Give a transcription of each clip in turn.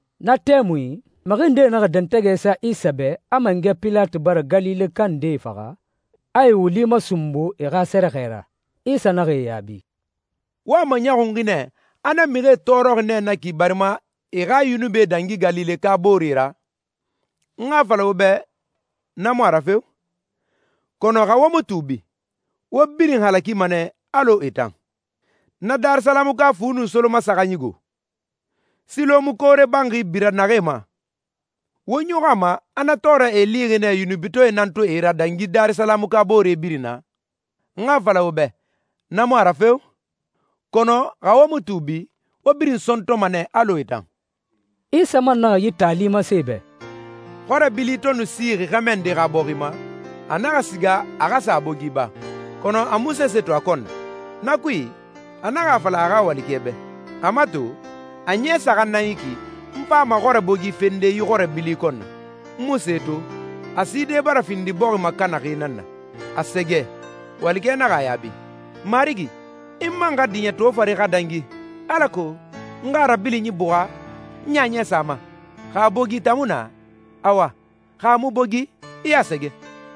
Na tɛmui, mixi ndee naxa dɛntɛgɛ sa Isa bɛ a mangɛ Pilati bara Galileka ndee faxa, a e wuli masunbu e xa sɛrɛxɛ ra. Isa naxa e yaabi, «Wo a maɲɔxunxi nɛ a na mixie tɔɔrɔxi nɛ na ki barima e xa yunubi dangi Galileka booree ra? N xa a fala wo bɛ na mu a ra feo! Kɔnɔ xa wo mu tuubi, wo birin halakima nɛ alɔ e tan. Na Darisalamuka fu nun solomasaxanyi go, Silɔmu koore banxi bira naxee ma? Wo ɲɔxɔ a ma a na tɔɔrɛ e lixi nɛ yunubitɔɛe nan to e ra dangi Darisalamuka boore birin na? N xa a fala wo bɛ na mu a ra feo! Kɔnɔ xa wo mu tuubi, wo birin sɔntɔma nɛ alɔ e tan.» Isa man naxa yi taali masen e bɛ. «Xɔrɛ bili to nu sixi xɛmɛ nde xa bɔxi ma, a naxa siga a xa sa a bogi ba, kɔnɔ a mu sese to a kɔn na. Na kui, a naxa a fala a xa walikɛ bɛ, ‹A mato, a ɲɛ saxan nan yi ki n fama xɔrɛ bogi fende yi xɔrɛ bili kɔn na, n mu se to. A side bara findi bɔxi makanaxi nan na! A sɛgɛ!› Walikɛ naxa a yaabi, ‹Marigi, i man xa diɲɛ toofare xa dangi, alako n xa a rabilinyi buxa, n ɲaɲɛ sa a ma. Xa a bogi tamuna, awa. Xa a mu bogi, i a sɛgɛ.›»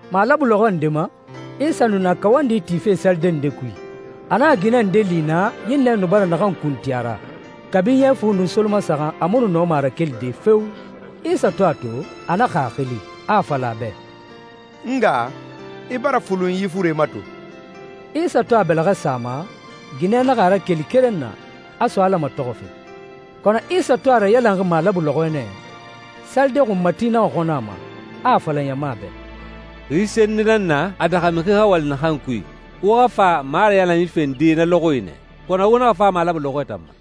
Malabu lɔxɔ nde ma, Isa nu na kawandi tife salide nde kui. A naxa ginɛ nde li naa ɲinnɛ nu bara naxan kuntin a ra. Kabi ɲɛ fu nun solomasaxan a mu nu nɔma a rakelide feo! Isa to a to, a naxa a xili, a a fala a bɛ, «N nga, i bara fulun yi fure ma to.» Isa to a bɛlɛxɛ sa a ma, ginɛ naxa a rakeli keren na, a so Ala matɔxɔfe. Kɔnɔ Isa to a rayalanxi malabu lɔxɔɛ nɛ, salide xunmati naxa xɔnɔ a ma, a a fala ɲama bɛ, «Xi senni nan na a daxa mixi xa wali naxan kui. Wo xa fa marayalanyi fende na lɔxɔɛe nɛ, kɔnɔ wo naxa fa malabu lɔxɔɛ tan ma.»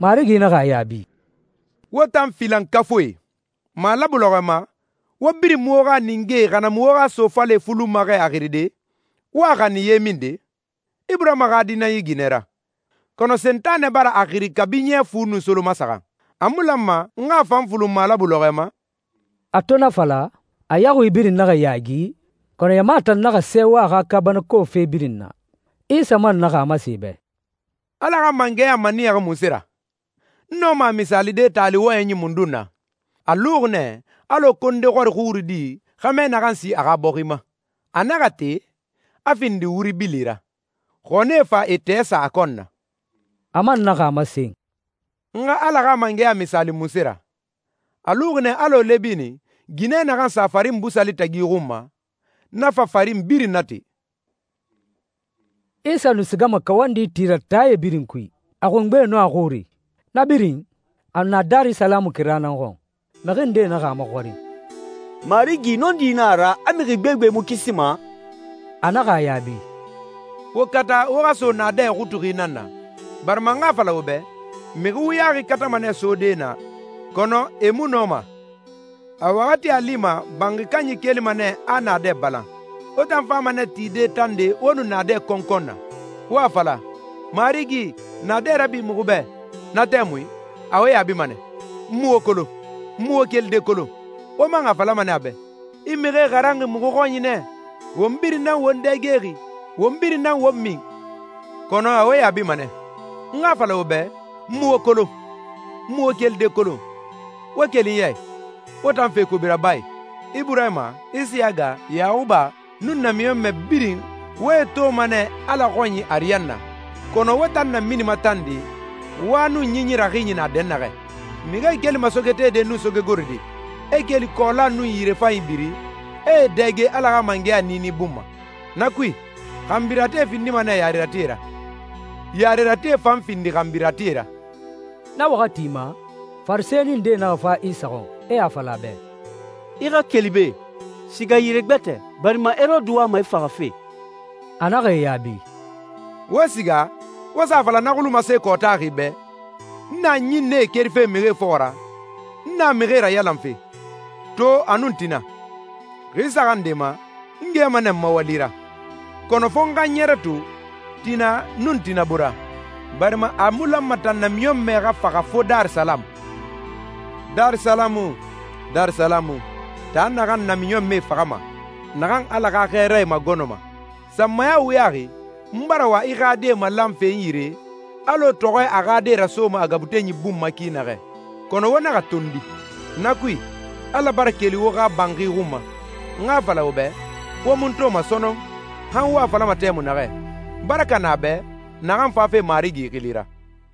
Marigi naxa a yaabi, «Wo tan filankafuie! Malabu lɔxɔɛ ma, wo birin mu wo xa ninge xa na mu wo xa sofale fulunma xɛ a xiride, wo a xanin ye minde? Iburahima xa di nan yi ginɛ ra, kɔnɔ Sentanɛ bara a xiri kabi ɲɛ fu nun solomasaxan. A mu lanma n xa a fan fulun malabu lɔxɔɛ ma?» A to na fala, a yaxui birin naxa yaagi, kɔnɔ ɲama tan naxa sɛɛwa a xa kaabanako fe birin na. Isa man naxa a masen e bɛ, «Ala xa mangɛya maniyaxi munse ra? N nɔma a misaalide tali wɔyɛnyi mundun na? A luxi nɛ alɔ konde xɔri xurudi xɛmɛ naxan si a xa bɔxi ma. A naxa te, a findi wuri bili ra, xɔnie fa e tɛɛ sa a kɔn na.» A man naxa a masen, «N xa Ala xa mangɛya misaali munse ra? A luxi nɛ alɔ lɛbini, ginɛ naxan sa farin busali tagi xun ma, na fa farin birin nate.» Isa nu sigama kawandi ti ra taae birin kui, a xungbe nun a xuri. Na birin, a nu na Darisalamu kira nan xɔn. Mixi nde naxa a maxɔrin, «Marigi, nɔndi nan a ra, a mixi gbegbe mu kisima?» A naxa a yaabi, «Wo kata wo xa so naadɛ ixutuxi nan na, barima n xa a fala wo bɛ, mixi wuyaxi katama nɛ sode naa, kɔnɔ e mu nɔma. A waxati a lima banxi kanyi kelima nɛ a naadɛ balan. Wo tan fama nɛ tide tande wo nu naadɛ kɔnkɔn na, wo a fala, ‹Marigi, naadɛ rabi muxu bɛ.› Na tɛmui, a wo yaabima nɛ, ‹N mu wo kolon, n mu wo kelide kolon.› Wo man a falama nɛ a bɛ, ‹I mixie xaranxi muxu xɔnyi nɛ, won birin nan won dɛgexi, won birin nan won min.› Kɔnɔ a wo yaabima nɛ, ‹N xa a fala wo bɛ, n mu wo kolon, n mu wo kelide kolon. Wo keli n ya i, wo tan fe kobi rabae!› Iburahima, Isiyaga, Yaxuba, nun namiɲɔnmɛ birin, wo e toma nɛ Ala xɔnyi ariyanna, kɔnɔ wo tan naminima tande, wa nun ɲinyi raxinyi na dɛnnaxɛ. Mixie kelima sogetede nun sogegorode, e keli kɔɔla nun yirefanyi biri, e e dɛge Ala xa mangɛya niini bun ma. Na kui, xanbiratie findima nɛ yareratie ra, yareratie fan findi xanbiratie ra.» Na waxati ma, Farisɛni ndee naxa fa Isa xɔn, e a fala a bɛ, «I xa keli be. Siga yire gbɛtɛ, barima Herode wama i faxafe.» A naxa e yaabi, «Wo siga, wo sa a fala na xulumase kɔɔtaxi bɛ, n na ɲinnɛe kerife mixie fɔxɔ ra, n na mixie rayalanfe, to a nun tina. Xi saxan nde ma, n gɛma nɛ n ma wali ra. Kɔnɔ fo n xa n ɲɛrɛ to, tina nun tina bora, barima a mu lanma tan namiɲɔnmɛ xa faxa fo Darisalamu.» «Darisalamu, Darisalamu, taa naxan namiɲɔnmɛe faxama, naxan Ala xa xɛɛrae magɔnɔma. Sanmaya wuyaxi n bara wa i xa die malanfe n yire, alɔ tɔxɔɛ a xa die rasoma a gabutenyi bun ma ki naxɛ, kɔnɔ wo naxa tondi! Na kui, Ala bara keli wo xa banxi xun ma. N xa a fala wo bɛ, wo mu n toma sɔnɔn, han wo a falama tɛmui naxɛ, ‹Baraka na a bɛ naxan fafe Marigi xili ra!›»